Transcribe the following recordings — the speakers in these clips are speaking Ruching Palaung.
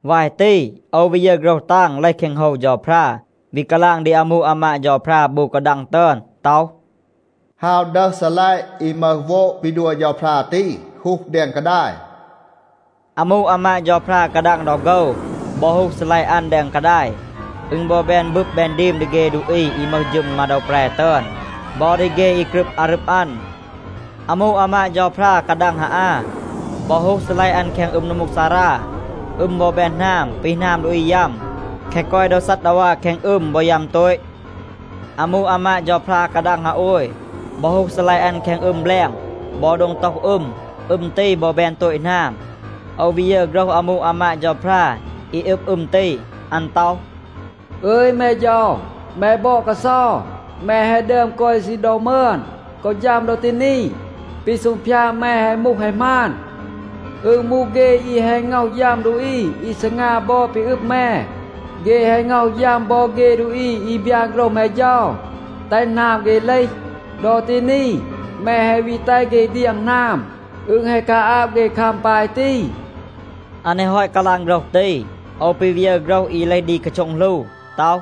วาย ตี, โอว วี ยึร โฆรห ตาง เลห แคง โฮว เฌาพรา, วี กาลาง ดี อามู อามาด เฌาพรา บู กาดัง ตึอน ต็อห, “ฮาว ดึห ซีลัยะ อี มึห โวด ปี ดัว เฌาพรา ตี, ฮูห แดง กาดาย.” อามู อามาด เฌาพรา กาดัง ดอ โฆว บอ ฮูห ซีลัยะ อัน แดง กาดาย, อึณ บอ แบน บึบ แบน ดีม ดี เฆ ดูอี อี มึห ฌึม มาโดว แปร ตึอน บอ ดี เฆ อี กรึบ อารึบ อัน. อามู อามาด เฌาพรา กาดัง ฮาอา บอ ฮูห ซีลัยะ อัน แคง อึม นัมมูกซารา. อึม บอ แบน หนาม ปี หนาม ดูอี ยัม. แคะ กอย โดว ซัดดาวา แคง อึม บอ ยัม โตต. อามู อามาด เฌาพรา กาดัง ฮาโอย บอ ฮูห ซีลัยะ อัน แคง อึม แบลง บอ โดง โตห อึม. อึม ตี บอ แบน โตต หนาม. โอว วี ยึร โฆรห อามู อามาด เฌาพรา อี อึบ อึม ตี. อัน ต็อห, “อึย แม เฌา, แม บอด กาเซา, แม แฮะ ดึอม กอย ซีณ ดอ มึอน กอ ฌัม ดอ ตี นี. ปี ซูงพยาด แม แฮะ มูห แฮะ หมาน. อึณ มูห เฆ อี แฮะ ง็อห ยัม ดูอี อี ซีงา บอด ปี อึบ แม. เฆ แฮะ ง็อห ยัม บอ เฆ ดูอี อี บยาน โฆรห แม เฌา, แตห หนาม เฆ เลห. ดอ ตี นี แม แฮะ วี แตห เฆ เดียง หนาม. อึณ แฮะ กาอาบ เฆ คัม ปาย ตี.” อัน แฮะ ฮอต กาลาง โฆรห ตี, โอว ปี วี ยึร โฆรห อี เลห ดี กาโช็ง หลู ต็อห,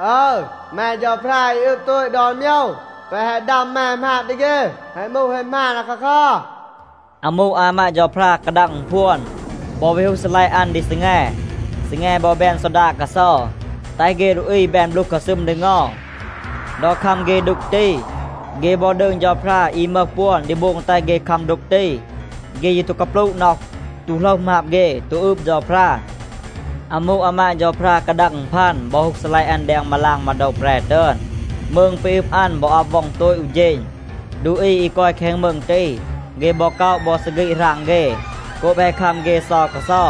“อึร, แม เฌาพรา อี อึบ โตต ดอน โมยว, แปะ แฮะ ดัม แม หมาบ ดี เฆ แฮะ มูห แฮะ หมาน อาคาคัร.” อามู อามาด เฌาพรา กาดัง อึณพวน บอ วี ฮูห ซีลัยะ อัน ดี ซีแง. ซีแง บอ แบน ซอดาด กาเซา, แตห เฆ ดูอี แบน บลูห กาซึม ดี เงา. ดอ คัม เฆ ดูก ตี, เฆ บอ ดืง เฌาพรา อี มึห ปวน ดี โบง แตห เฆ คัม ดูก ตี. เฆ ยี ตู กาปลูะ น็อห, ตู โหลห หมาบ เฆ, ตู อืบ เฌาพรา. อามู อามาด เฌาพรา กาดัง อึณพัน บอ ฮูห ซีลัยะ อัน แดง มาลาง มาโดว แปร ตึอน. มืง ปี อึบ อัน บอ อับ ว็อง โตต อู เฌณ. ดูอี อี กอย แคง มืง ตี, เฆ บอ ก็อะ บอ ซีฆีด หราง เฆ โกบ แฮะ คัม เฆ เซา กาเซา.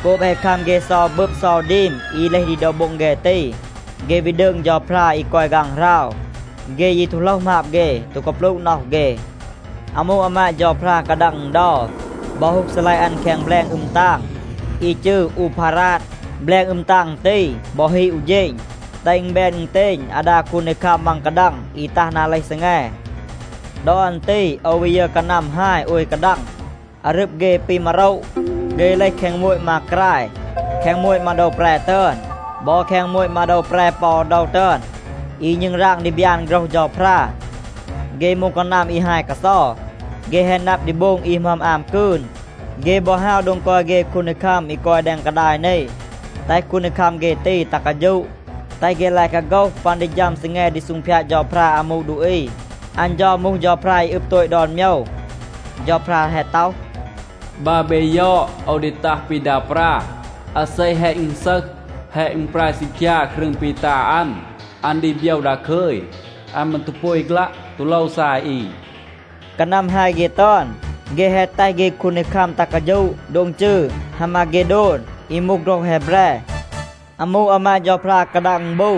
โกบ แฮะ คัม เฆ เซา บึบ เซา ดีม อี เลห ดี โดว โบ็ง เฆ ตี, เฆ วี ดืง เฌาพรา อี กอย ฆางหราว. เฆ ยี ตู โหลห หมาบ เฆ, ตู กาปลูะ น็อห เฆ. อามู อามาด เฌาพรา กาดัง อึณเดา บอ ฮูห ซีลัยะ อัน แคง แบลง อึม ตาง อี จืร อูพาราด. แบลง อึม ตาง ตี บอ ฮีด อู เฌณ, แตห อึณ แบน อึณเตณ อาดา คูนดีคัม มัง กาดัง อี ตัห นา เลห ซีแง. ดอ อัน ตี โอว วี ยึร กานัม ฮาย โอย กาดัง. อารึบ เฆ ปี มาโระ. เฆ เลห แคง โมต มากราย, แคง โมต มาโดว แปร ตึอน, บอ แคง โมต มาโดว แปร ปอ โดว ตึอน, อี ณึงราง ดี บยาน โฆรห เฌาพรา. เฆ มูห กานัม อี ฮาย กาเซา. เฆ แฮะ นับ ดี โบง อี หมึอม อาม กืน. เฆ บอ ฮาว โดง กอย เฆ คูนดีคัม อี กอย แดง กาดาย นี, แตห คูนดีคัม เฆ ตี ตัห กาฌูะ, แตห เฆ ลาย กาโฆห ปัน ดี ฌัม ซีแง ดี ซูงพยาด เฌาพรา อามู ดูอี. อัน เฌา มูห เฌาพรา อี อึบ โตต ดอน โมยว. เฌาพรา แฮะ ต็อห, “บัร เบ ยอด, โอว ดี ตัห ปี ดา ปรา. อาเซ แฮะ อึณซึห, แฮะ อึณปราย ซีคยา ครึง ปี ตา อัน, อัน ดี โบยว ดาคึย. อัน มืร ตู อาฆลัะ, ตู โลว ซาย อี.” กานัม ฮาย เฆ ตึอน, เฆ แฮะ แตห เฆ คูนดีคัม ตัห กาฌูะ โดง จืร ฮามาเฆโดน, อี มูห โฆรห แฮแบร. อามู อามาด เฌาพรา กาดัง อึณบู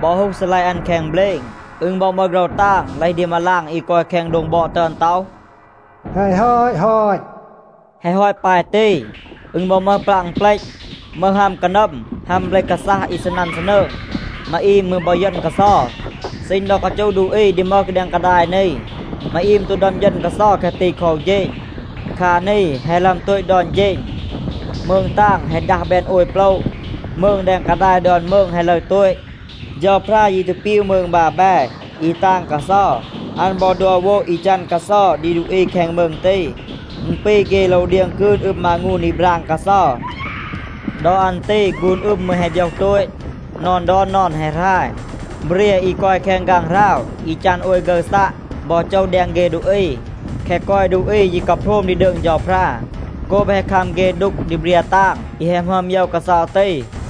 บอ ฮูห ซีลัยะ อัน แคง เบลณ. อึณ บอ มึห โฆรห ตาง เลห ดี มาลาง อี กอย แคง โดง บอด ตึอน ต็อห, “แฮะ ฮอต ฮอต.” แฮะ ฮอต ปาย ตี, อึณ บอ มึห ปลัะ อึณเปลต, มึห ฮัม กานัม, ฮัม เบล กาซัห อี ซีนัน ซีนืง. มาอีม มืร บอ เยณ กาเซา. ซีณ ดอ กาจูห ดูอี ดี มึห แดง กาดาย นี, มาอีม ตู ดึอม เยณ กาเซา แคะ ตี คอ อู เฌณ. คา นี แฮะ หลึอม โตต ดอน เฌณ. มืง ตาง แฮะ ดัห แบน โอย โปละ. มืง แดง กาดาย ดอน มืง แฮะ ลึร โตต. เฌาพรา ยี ตู ปีว มืง บาแบ อี ตาง กาเซา. อัน บอ ดัว โวด อี จัน กาเซา ดี ดูอี แคง มืง ตี. อึณ ปี เฆ โลว เดียง กืน อึม มางูน อี ปราง กาเซา. ดอ อัน ตี ฆูน อึม มืร แฮะ โบยห โตต. นอน ดอน นอน แฮะ หราย. เบรีย อี กอย แคง ฆางหราว อี จัน โอย ฆึร ซัะ บอ โจห แดง เฆ ดูอี. แคะ กอย ดูอี ยี กาโพรม ดี ดืง เฌาพรา โกบ แฮะ คัม เฆ ดูก ดี เบรีย ตาง อี แฮะ หมึอม โยว กาเซา ตี.